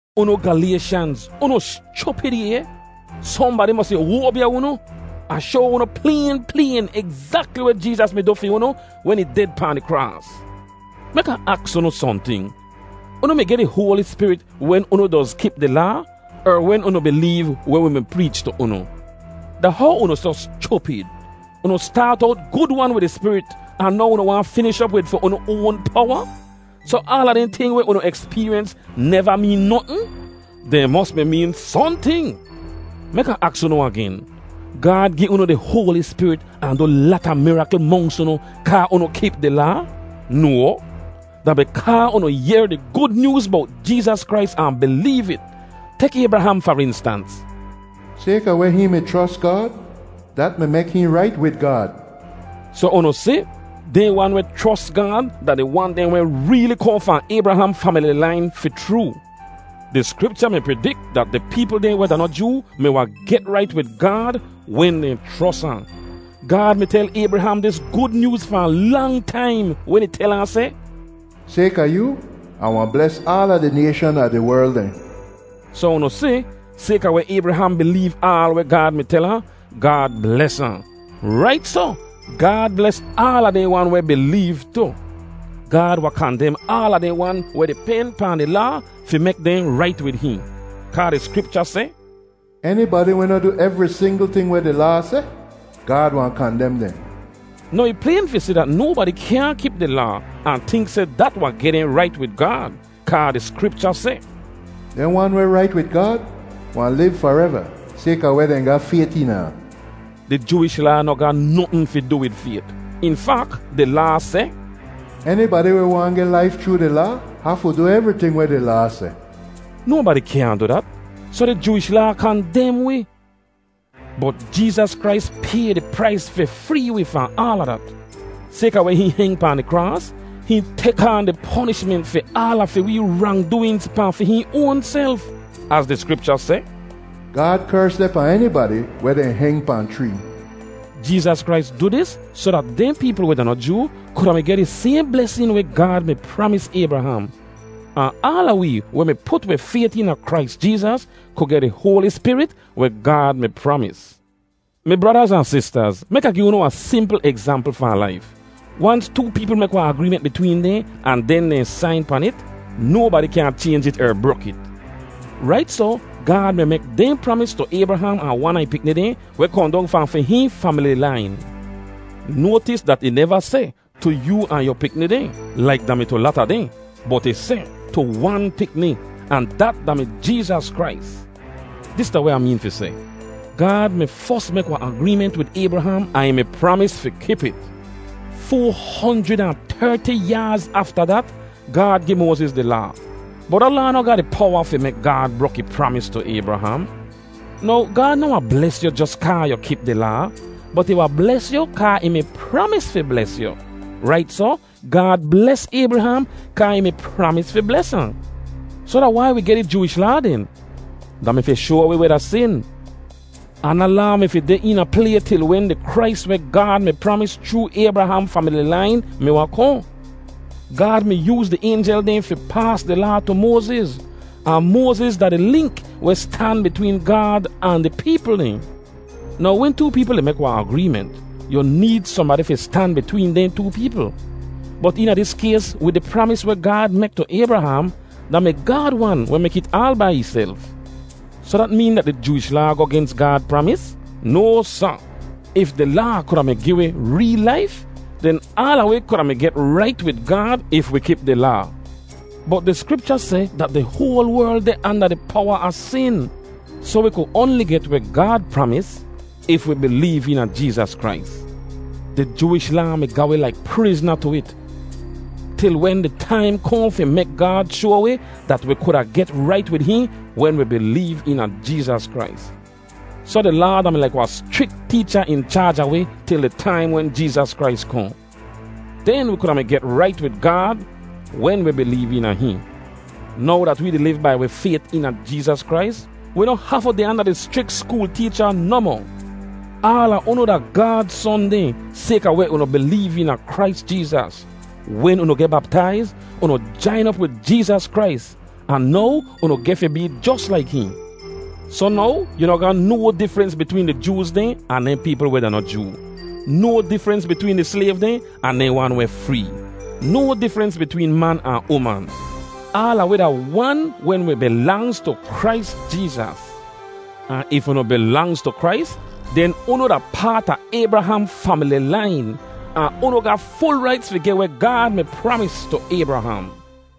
Unu Galayshanz, unu schupid ay! Sohnbadi mosi oabya unu. Ah shoa unu playn playn egzakli weh Jeezas mi du fi unu wen ih ded pahn di kraas. Mek Ah aks unu sohnting: unu mi geh di Hoali Spirit wen unu doz kip di Laa, er wen unu bileev weh wi mi preech tu unu? Da how unu soh schupid? Unu staat owt gud-wan wid di Spirit ahn now unu waahn finish op wid fi unu oan powa? Soh aala dehn ting weh unu ekspeeryens neva meen notn? Dehn mos mi meen sohnting. Mek Ah aks unu agen: Gaad gi unu di Hoali Spirit ahn du lata mirakl monks unu kaa unu kip di Laa? No, da bikaa unu yehr di Gud Nyooz bowt Jeezas Krais ahn bileev it. Tek Aybraham far instans: “Sayka weh hihn mi chros Gaad, dat mi mek hihn rait wid Gaad.” Soh unu si, dehn wan weh chros Gaad da di wan dehn weh reeli kohn fahn Aybraham famili lain fi chroo. Di Skripcha mi pridik dat di peepl dehn weh da noh Joo mi wahn get rait wid Gaad wen dehn chros ahn. Gaad mi tel Aybraham dis Gud Nyooz fahn lang taim wen ih tel ahn seh, “Sayka yoo, Ah wahn bles aala di nayshan a di werl dehn.” Soh unu si, sayka weh Aybraham bileev aal weh Gaad mi tel ahn, Gaad bles ahn. Rait soh, Gaad bles aala dehn wan weh bileev tu. Gaad wahn kandem aala dehn wan weh di pen pahn di Laa fi mek dehn rait wid hihn. Kaa di Skripcha seh, “Enibadi weh noh du evri singl ting weh di Laa seh, Gaad wahn kandem dehn.” Now ih playn fi si dat nobadi kyaahn kip di Laa ahn tink seh dat wahn geh dehn rait wid Gaad, kaa di Skripcha seh, “Dehn wan weh rait wid Gaad wahn liv fareva sayka weh dehn ga fayt eena ahn.” Di Jooish Laa noh ga notn fi du wid fayt. In fak, di Laa seh, “Enibadi weh waahn geh laif chroo di Laa hafu du evriting weh di Laa seh.” Nobadi kyaahn du dat, soh di Jooish Laa kandem wi, bot Jeezas Krais pay di prais fi free wi fahn aala dat. Sayka weh hihn heng pahn di kraas, hihn tek aan di ponishment fi aala fi wee rangdooinz pahn fi hihn oanself. Az di Skripcha seh, “Gaad kers deh pahn enibadi weh dehn heng pahn chree.” Jeezas Krais du dis soh dat dehn peepl weh da noh Joo kuda mi geh di sayhn blesin weh Gaad mi pramis Aybraham. Ahn aala wee weh put wi fayt eena Krais Jeezas ku geh di Hoali Spirit weh Gaad mi pramis. Mi bradaz ahn sistaz, mek Ah gi unu wahn simpl egzampl fahn laif: wans too peepl mek wahn agreement bitween dehn ahn den dehn sain pan it, nobadi kyaahn chaynj it er brok it. Rait soh, Gaad mi mek dehn pramis tu Aybraham ahn wan a ih pikni dehn weh kohn dong fahn fi hihn famili lain. Noatis dat ih neva seh, “Tu yoo ahn yu pikni dehn,” laik da mi tu lata dehn; bot ih seh, “tu wan pikni,” ahn dat da-mi Jeezas Krais. Dis da weh Ah meen fi seh: Gaad mi fos mek wahn agreement wid Aybraham ahn ih mi pramis fi kip it. Foa honjrid ahn terti yaaz afta dat Gaad gi Moaziz di Laa, bot da Laa noh ga di powa fi mek Gaad brok ih pramis tu Aybraham. Now Gaad noh wahn bles yu jos kaa yu kip di Laa, bot ih wahn bles yu kaa ih mi pramis fi bles yu. Rait soh, Gaad bles Aybraham kaa ih mi pramis fi bles ahn. Soh da wai wi geh di Jooish Laa den? Da mi fi shoa wi weh da sin; ahn da Laa mi fi deh eena play til wen di Krais weh Gaad mi pramis chroo Aybraham famili lain mi wahn kohn. Gaad mi yooz di aynjel dehn fi paas di Laa tu Moaziz, ahn Moaziz da di link weh stan bitween Gaad ahn di peepl dehn. Now wen too peepl di mek wahn agreement, yu need sohnbadi fi stan bitween dehn too peepl. Bot eena dis kays wid di pramis weh Gaad mek tu Aybraham, da mi Gaad wan weh mek it aal bai ihself. Soh dat meen dat di Jooish Laa goh gens Gaad pramis? No, sa! If di Laa kuda mi gi wi reel laif, den aala wi kuda mi get rait wid Gaad if wi kip di Laa. Bot di Skripcha seh dat di hoal werl deh anda di powa a sin; soh wi ku oanli get weh Gaad pramis if wi bileev eena Jeezas Krais. Di Jooish Laa mi ga wi laik prizna tu it til wen di taim kohn fi mek Gaad shoa wi dat wi kuda get rait wid hihn wen wi bileev eena Jeezas Krais. Soh di Laa da-mi laik wahn schrik teecha in chaaj a wi til di taim wen Jeezas Krais kohn. Den wi kuda mi get rait wid Gaad wen wi bileev eena hihn. Now dat wee di liv bai wi fayt eena Jeezas Krais, wi noh hafu deh anda di schrik skool teecha nohmoh. Aala unu da Gaad son dehn sayka weh unu bileev eena Krais Jeezas. Wen unu geh baptaiz, unu jain op wid Jeezas Krais, ahn now unu geh fi bee jos laik hihn. Soh now, yu noh ga no difrens bitween di Jooz dehn ahn dehn peepl weh da noh Joo; no difrens bitween di slayv dehn ahn dehn wan weh free; no difrens bitween man ahn uman. Aala wi da wan wen wi bilangz tu Krais Jeezas. Ahn if unu bilangz tu Krais, den unu da paat a Aybraham famili lain, ahn unu ga ful raits fi geh weh Gaad mi pramis tu Aybraham.